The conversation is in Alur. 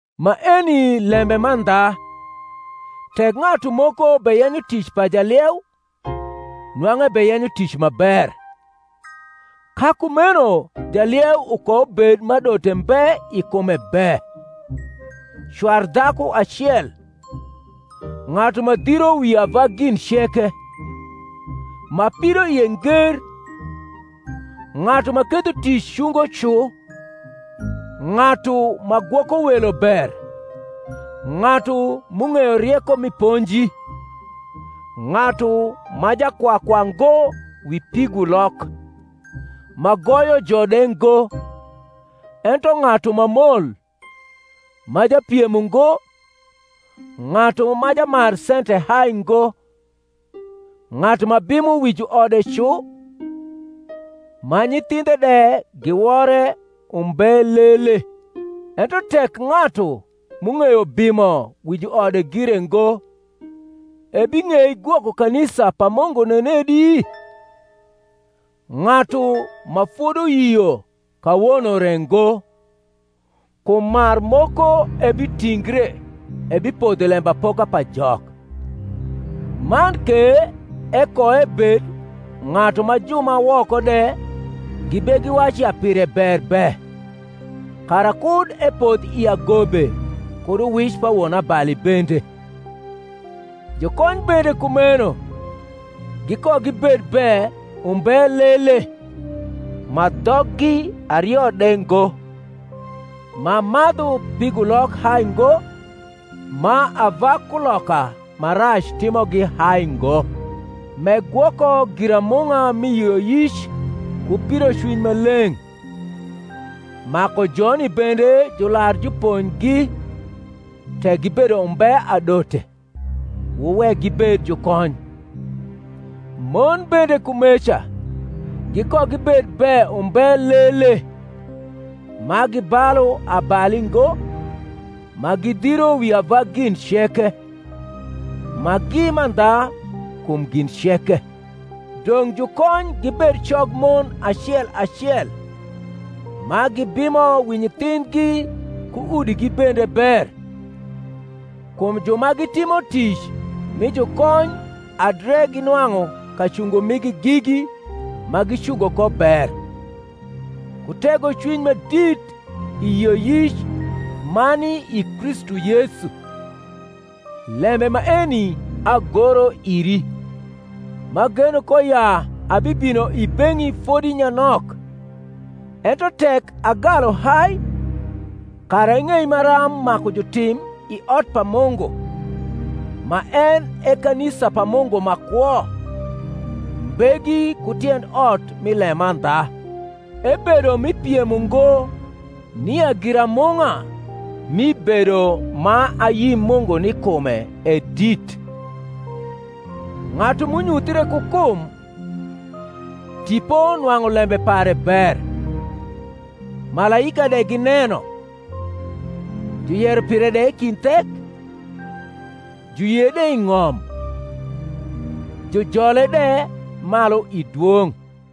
Maeni lembe mandha, Tek ng’atu moko beyenyo tic pa jalieu, nwang’u ebeyenyo tic ma ber. Ka kumeno jalieu ukoubed ma adote mbe i kume be, cwar dhaku acel, ng’atu ma dhiro wi ava gin ceke, ma pidoie nger, ng’atu ma ketho tic cungo cu, ng’atu ma gwoko welo ber, ng’atu m’ung’eyo rieko mi ponji; ng’atu ma jakwakwa ngo wi pigulok, ma goyo jo de ngo; ento ng’atu ma mol, ma japiem ungo, ng’atu ma jamar sente hai ngo; ng’atu ma bimo wi juode cu, ma nyithindhe de giwore umbe lele; (ento tek ng’atu m’ung’eyo bimo wi juode gire ngo, ebing’ei gwoko kanisa pa Mungu nenedi?) ng’atu ma foduyio kawono re ngo, kum marmoko ebitingre ebipodho i lembapoka pa Jok. Man ke ekoebed ng’atu ma ju ma woko de gibegiwacu ya pire ber be; kara kud epodh i agobe kud uwic pa wonabali bende. Jukony bende kumeno gikogibed be umbe lele, ma dhoggi ario de ngo, ma madhu pigulok hai ngo, ma ava kuloka ma rac timogi hai ngo; m’egwoko giramung’a mi yioyic ku pidocwiny ma leng’. Maku joni bende jular juponjgi; tek gibedo umbe adote, wuwek gibed jukony. Mon bende kumeca gikogibed be umbe lele, ma gibalu abali ngo, ma gidhiro wi ava gin ceke, ma gi mandha kum gin ceke. Dong’ jukony gibed cog mon acel acel, ma gibimo wi nyithindhgi ku udigi bende ber. Kum ju ma gitimo tic mi jukony adre ginwang’u kacungo migi gigi ma gicungo ko ber, ku tegocwiny ma dit i yioyic ma ni i Kristu Yesu. Lembe maeni agoro iri, m’ageno ko ya abibino i beng’i fodi nyanok; tek agalu hai, kara ing’ei maram maku jutrm i ot pa Mungu,ma en e kanisa pa Mungu ma kwo, mbegi ku tiend ot mi lemandha. Ebedo mi piem ungo nia giramung’a mi bedo ma ayi Mungu ni kume e dit; Ng’atu m’unyuthre ku kum, Tipo nwang’u lembe pare ber, Malaika de gineno, Juyero pire de i kind thek, Juyie de i ng’om, Jujole de malu i dwong’.